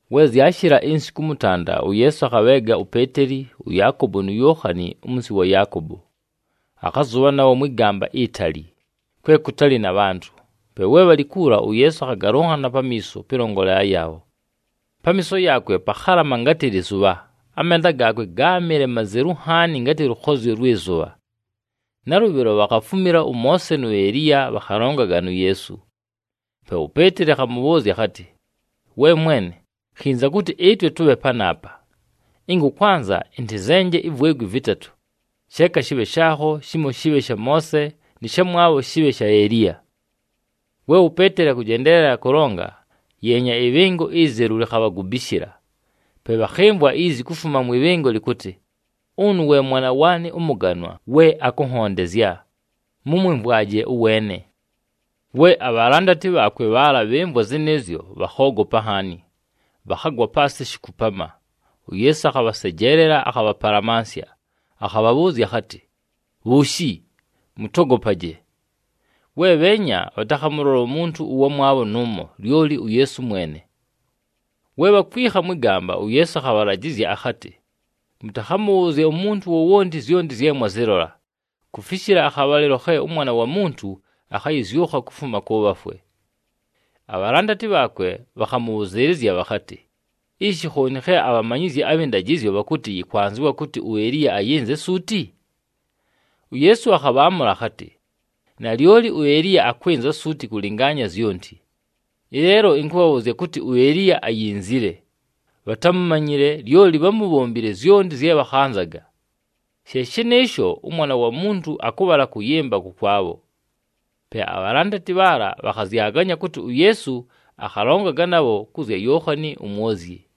We zyashɨla insiku ʉmʉtanda, uYeesu akhabheega uPeeteli, ʉYaakobo nu Yookhani umunsi wa Yaakobo. Akhazʉbha nabho mwɨ gamba itali, kwe kʉtalɨ na bhantʉ. Pe we bhalɨ kuula, uYeesu akhagalʉnhana pamiiso pɨlongolela yaabho. Pamiiso yaakwe pakhalama ngatɨ lɨzʉbha, amenda gaakwe gáamɨle mazelu nhaani ngatɨ lʉkhozyo lwɨ zʉbha. Nalʉbhɨlo, bhakhafumila ʉMoose nu Eliya, bhakhalongaga nu Yeesu. Pe uPeeteli akhamʉbhʉʉzya akhatɨ, “We Mwene, khinza kʉtɨ ɨtwe tʉbhe panaapa! Ɨnga ʉkwanza, ɨntɨzenje ivwegwi vɨtatʉ. Sheeka shɨbhe shaakho, shimo shɨbhe sha Moose, nɨ shamwabho shɨbhe sha Eliya.” We uPeeteli akʉjendeelela kʉlonga, yeenya, ɨbhɨngo izelu likhabhagubishila. Pe bhakhɨmvwa izi kufuma mwɨ bhɨngo lɨkʉtɨ, “Ʉnʉ we Mwana waanɨ ʉmʉganwa we akʉnhondezya, mʉmwɨmvwaje ʉweene!” We abhalandati bhaakwe bhaala bhɨmvwa zɨnɨɨzyo, bhakhoogopa nhaani, bhakhagwa paasɨ shikupama. UYeesu akhabhasejeelela, akhabhapalamansya, akhabhabhʉʉzya akhatɨ, “Bhuushi, mʉtogopaje!” We bheenya, bhatakhamʉlola umuntu ʉwamwabho nʉʉmo, lyoli uYeesu mwene. We bhakwikha mwɨ gamba, uYeesu akhabhalajɨzya akhatɨ, “Mʉtakhamʉbhʉʉzye umuntu wowonti zyonti zye mwazɨlola, kufishila akhabhalɨlo khe ʉMwana wa Muntu akhayɨzyʉkha kufuma kʉ bhafwe.” Abhalandati bhaakwe bhakhamʉbhʉzɨɨlɨzya bhakhatɨ, “Ishi khooni khe abhamanyizyi abhɨ ndajɨzyo bhakʉtɨ, yɨkwanzɨwa kʉtɨ uEliya ayɨnze suuti?” UYeesu akhabhaamʉla akhatɨ, “Nalyoli uEliya akwɨnza suuti kʉlɨngaanya zyonti. Ɨleelo ɨnkʉbhabhʉʉzya kʉtɨ, uEliya ayinzile, bhatámumanyile, lyoli bhámubhombile zyonti zye bhakhanzaga. She shɨnɨɨsho, ʉMwana wa Muntu akʉbhala kʉyɨmba kʉkwabho.” Pe abhalandati bhaala bhakhazyaganya kʉtɨ uYeesu akhalongaga nabho kʉ zya Yookhani uMwozyi.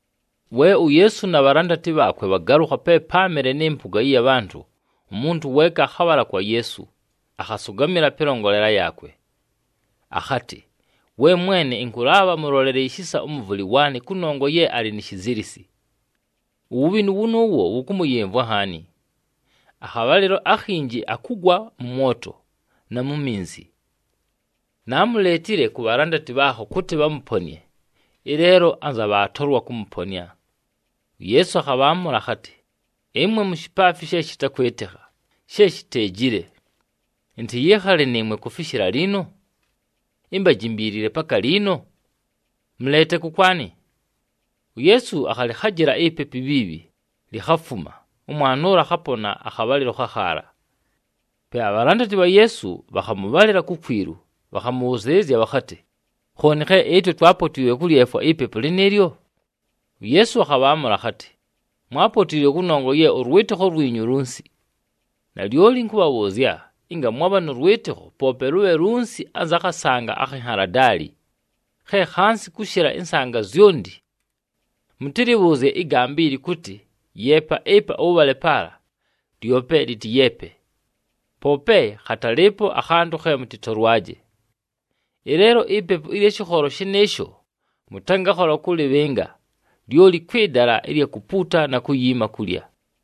We uYeesu na bhalandati bhaakwe bhagalʉkha pe páamɨle nɨ mpʉga ɨya bhantʉ, umuntu weeka akhabhala kwa Yeesu, akhasʉgamɨla pɨlongolela yaakwe. Akhatɨ, “We Mwene, ɨnkʉlaabha mʉlolele ishisa ʉmʉvʉlɨ waanɨ kʉnongwa ye alɨ ni shizilisi. Uwubhinu wʉnʉʉwo, wʉkʉmʉyɨmvwa nhaani. Akhabhalɨlo akhinji akugwa mʉ mwoto na mu minzi. Naamuleetile ku bhalandati bhaakho kʉtɨ bhamʉponɨe, ɨleelo anza bhaatolwa kʉmʉponɨa.” UYeesu akhaamʉla akhatɨ, “Ɨmwe mushipaafi she shɨtakwɨtɨkha, she shiteejile. Ɨntɨyɨɨkhale nɨɨmwe kufishila liino? Imbajimbiilile paka liino? Mʉleete kʉkwanɨ!” UYeesu akhalɨkhajɨla ipepu ibhiibhi, likhafuma, ʉmwana ʉla akhapona akhabhalɨlo khakhaala. Pe abhalandati bha Yeesu bhakhamʉbhalɨla kukwilu, bhakhamʉbhʉzɨɨlɨzya bhakhatɨ, “Khooni khe ɨtwe twaapotiilwe kʉlyefwa ipepu lɨnɨɨlyo?” UYeesu akhabhaamʉla akhatɨ, “Mwaapotiilwe kʉnongwa ye ʉlwɨtɨkho lwinyu lunsi. Nalyoli ɨnkʉbhabhʉʉzya, ɨnga mwabha nʉ lwɨtɨkho, poope lʉbhe lunsi anza khasanga akhi nhaladaali, khe khansi kʉshɨla ɨnsanga zyonti, mʉtɨlɨbhʉʉzye ɨgamba ili kʉtɨ, ‘Yeepa ɨpa, ʉbhale paala,’ lyope lɨtɨyeepe. Poope khatalɨɨpo akhantʉ khe mʉtɨtolwaje. [ Ɨleelo, ipepu ɨlya shɨkholo shɨnɨɨsho mʉtangakhola kʉlɨbhɨnga, lyoli kwɨ dala ɨlya kupuuta na kuyiima kulya.]”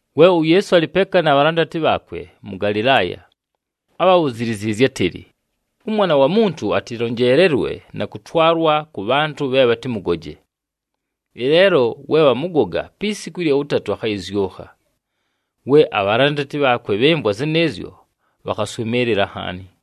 We uYeesu alɨ peeka na bhalandati bhaakwe mʉ Galɨlaaya, ábhabhuziizye átɨlɨ, “ɄMwana wa Muntu atɨlonjeelelwe na kʉtwalwa kʉ bhantʉ bhe bhatɨmʉgoje. Ɨleelo we bhamʉgoga, pi siku ɨlya wʉtatʉ akhayɨzyʉkha.” We abhalandati bhaakwe bhɨmvwa zɨnɨɨzyo, bhakhaswɨmɨɨlɨla nhaani.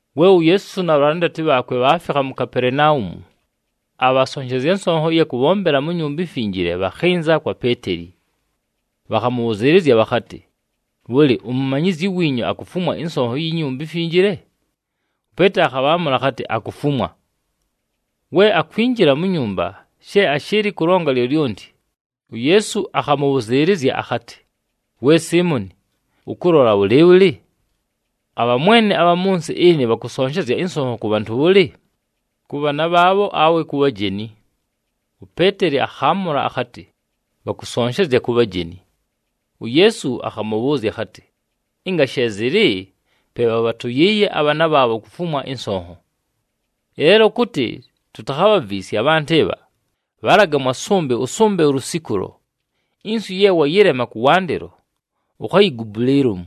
We uYeesu na bhalandati bhaakwe bhaafikha mu Kapelenaumu, abhasonshezya nsonho ɨya kʉbhombela mu Nyumba iMfinjile, bhakhɨnza kwa Peeteli. Bhakhamʉbhʉzɨɨlɨzya bhakhatɨ, “Bhʉlɨ, umumanyizyi wiinyu akufumwa ɨnsonho iyi Nyumba iMfinjile?” UPeeteli akhabhaamʉla akhatɨ, “Akufumwa.” We akwinjila mu nyumba, she ashɨɨlɨ kʉlonga lyolyonti, uYeesu akhamʉbhʉzɨɨlɨzya akhatɨ, “We Siimoni, ʉkʉlola bhʉlɨɨbhʉlɨ? Abhamwene abha mʉ nsɨ ɨnɨ bhakʉsonshezya ɨnsonho kʉ bhantʉ bhʉlɨ? Kʉ bhaana bhaabho awe ku bhajeni?” UPeeteli akhaamʉla akhatɨ, “Bhakʉsonshezya ku bhajeni.” UYeesu akhamʉbhʉʉzya akhatɨ, “Ɨnga she zɨlɨ, pe bhabhatʉyɨɨye abhaana bhaabho kufumwa ɨnsonho. Ɨleelo kʉtɨ tutakhabhaviisye abhantʉ ɨbha, bhalaga mwa sʉmbɨ ʉsʉmbe ulusikulo. Inswi ye wayɨlema kʉwandɨlo, ukhayigubule ilomu,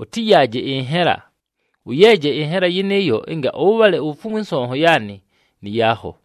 ʉtɨyaaje ɨnhela. Ʉyeeje ɨnhela yɨnɨɨyo ɨnga ʉbhale ufumwe ɨnsonho yaanɨ nɨ yaakho.”